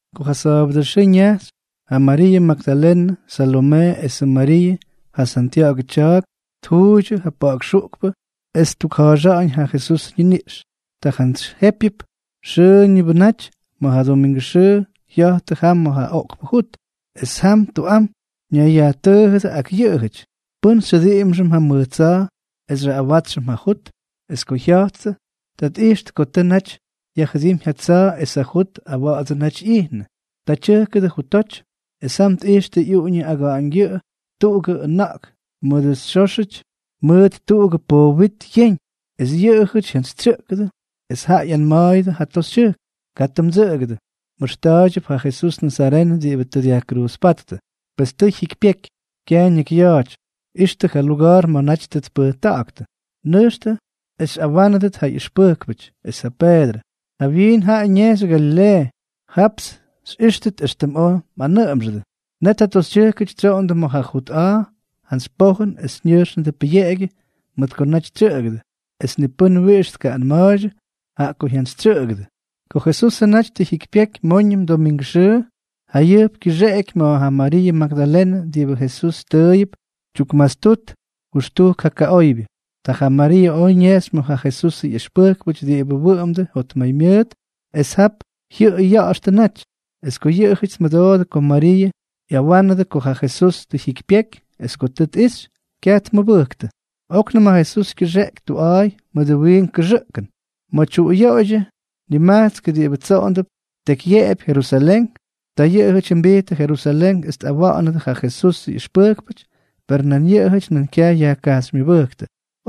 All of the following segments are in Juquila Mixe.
Ko ja sa̱a̱bʉdʉ xʉʉ ñajxy, ja Mariiʉ Magdalenʉ, Salomee esʉ Mariiʉ, ja Santya̱ꞌa̱gʉ tya̱a̱k, tjuuydyʉ ja pa̱ꞌa̱k xuꞌkpʉ es ttukja̱a̱xa̱ꞌa̱ñ ja Jesusʉ ñiniꞌx. Ta jantsy jépyʉp, xʉʉñʉbʉnʉ naty ma̱ ja domingʉ xʉʉ, jya̱jttʉ jam ma̱ ja oꞌkpʉ jut. Es jam tuꞌam ñayyajtʉʉjʉdʉ ak yʉꞌʉjʉty: —¿Pʉ́n xyjʉdiꞌimxʉm ja mʉj tsa̱a̱ es xyaꞌꞌawátsxʉm ja jut? Es ko jya̱jttʉ, ta tꞌijxtʉ ko tʉ naty yajjʉdímy ja tsa̱a̱ es ja jut awa̱ꞌa̱dsʉ naty ꞌyijnʉ. Ta tyʉjkʉdʉ jutoty, es jam tꞌijxtʉ ꞌyuꞌuñʉ aga̱ꞌa̱ñgyʉꞌʉ tuꞌugʉ ʉna̱ꞌk diꞌibʉ xóxyʉty mʉt tuꞌugʉ poop wit yeñ. Es yʉꞌʉjʉty jyantsytsyʉꞌkʉdʉ. Es jaꞌa ꞌyanma̱a̱yʉdʉ ja toxytyʉjkʉty: —Katʉ mdsʉꞌʉgʉdʉ. Mꞌʉxta̱a̱ydyʉp ja Jesús nazarenʉ diꞌibʉ tʉ dyajkruuzpáttʉ. Pes tʉ jyikypyeky. Kyaj ñakyya̱a̱ty. Ixtʉ ja luga̱a̱r ma̱ naty tʉ tpʉjta̱ꞌa̱ktʉ. Nʉjxtʉ es xyꞌawánʉdʉt ja ꞌyʉxpʉjkpʉty es ja Peedrʉ: “Jawyiin jaꞌa ñejxy Galileeʉ. Japts xyꞌíxtʉt éxtʉm oj mꞌanʉꞌʉmxʉdʉ.” Net ja toxytyʉjkʉty tsyoꞌondʉ ma̱ ja jut a̱a̱ jantsy pojʉn es ñʉjxnʉdʉ pʉyeꞌegyʉ mʉt ko naty tsyʉꞌʉgʉdʉ. Es ni pʉ́n wiꞌix tkaꞌꞌanma̱a̱ydyʉ, jaꞌa ko jyantsytsyʉꞌʉgʉdʉ. Ko Jesusʉ naty tʉ jyikypyeky móñʉm domingʉ xʉʉ, jayʉjp kyʉxeꞌky ma̱ ja Mariiʉ Magdalenʉ diꞌibʉ Jesús tʉʉyʉp tyukmastut jʉxtujk ja kaꞌóybyʉty. Ta ja Mariiʉ oj ñejxy ma̱ ja Jesusʉ ꞌyʉxpʉjkpʉty diꞌibʉ wʉꞌʉmdʉ jotmaymyʉʉt es jap jyʉꞌʉy ya̱ꞌa̱xtʉ naty. Es ko yʉꞌʉjʉty tmʉdoodʉ ko Mariiʉ ꞌyawánʉdʉ ko ja Jesús tʉ jyikypyeky es ko tʉ tꞌixy, kyaj tmʉbʉjktʉ. Oknʉm ja Jesús kyʉxeꞌky tuꞌa̱a̱y mʉdʉ wiink kʉxʉꞌkʉn ma̱ tyuꞌuyoꞌoydyʉ nimajtskpʉ diꞌibʉ tsoꞌondʉp tekyyeꞌepy Jerusalén. Ta yʉꞌʉjʉty jyʉmbijttʉ Jerusalén es tꞌawa̱ꞌa̱nʉdʉ ja Jesusʉ ꞌyʉxpʉjkpʉty; per nan yʉꞌʉjʉty kyaj yajkajxymyʉbʉjktʉ.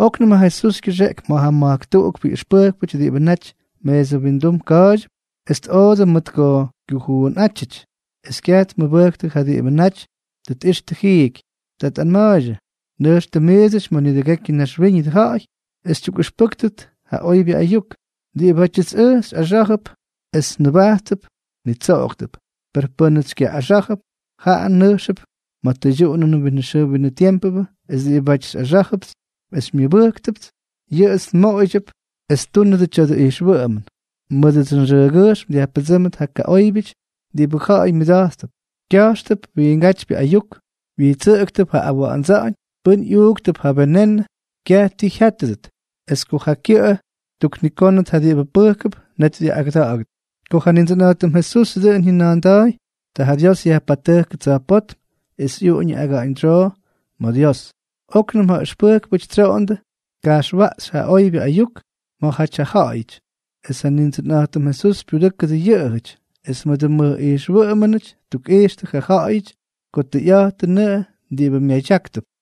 Oknʉm ja Jesús kyʉxeꞌky ma̱ ja ma̱jk tuꞌukpʉ ꞌyʉxpʉjkpʉty diꞌibʉ naty meesʉ windum ka̱a̱ydyʉp, es tꞌoodʉ mʉt ko kyujuunꞌátyʉty es kyaj tmʉbʉjktʉ ja diꞌibʉ naty tʉ tꞌixtʉ jiiky. Ta tꞌanma̱a̱ydyʉ: —Nʉjxtʉ miidsʉty ma̱ nidʉgekyʉ naxwíñʉdʉ ja̱ꞌa̱y es xytyukꞌʉxpʉ́ktʉt ja oybyʉ ayuk. Diꞌibátyʉts ʉj xyꞌaxá̱jʉp es nʉbajttʉp, nitsoꞌogʉp. Per pʉ́nʉts xykyaꞌꞌaxá̱jʉp, jaꞌa nʉjxʉp ma̱ ja tʉydyuꞌunʉnʉ winʉ xʉʉ winʉ tiempʉ. Es diꞌibáty xyꞌaxá̱jʉpts es xymyʉbʉ́ktʉts, yʉꞌʉts nmoꞌoydyʉp es ttúndʉt yʉ tya̱dʉ ijxwʉꞌʉmʉn: Mʉdʉdsʉ nxʉʉgyʉjxm dyajpʉdsʉ́mdʉt ja kaꞌóybyʉty diꞌibʉ ja̱ꞌa̱y myʉda̱jttʉp; kya̱jxtʉp wiingátypyʉ ayuk; wyijtsʉꞌʉktʉp ja awa̱ꞌa̱ndsa̱ꞌa̱ñ; pʉn ꞌyuuktʉp ja venenʉ, kyaj ti jyátʉdʉt; es ko ja kyʉꞌʉ ttuknikónʉt ja diꞌibʉ pʉjkʉp, net dyaꞌꞌagʉda̱ꞌa̱ktʉt. Ko ja Nindsʉnꞌa̱jtʉm Jesús dʉꞌʉn jyʉna̱a̱nda̱a̱y, ta ja Dios yajpatʉjkʉ tsa̱jpótm es ꞌyuꞌuñʉ aga̱ꞌa̱ñdsyoo ma̱ Dios. Oknʉm ja ʉxpʉjkpʉty tsyoꞌondʉ tka̱jxwaꞌxy ja oybyʉ ayuk ma̱jaty ja ja̱ꞌa̱yʉty. Es ja Nindsʉnꞌa̱jtʉm Jesús pyudʉ́kʉdʉ yʉꞌʉjʉty, es mʉdʉ mʉj ijxwʉꞌʉmʉnʉty ttukꞌixtʉ ja ja̱ꞌa̱yʉty ko tʉyꞌa̱jtʉnʉꞌʉ diꞌibʉ myadyáktʉp.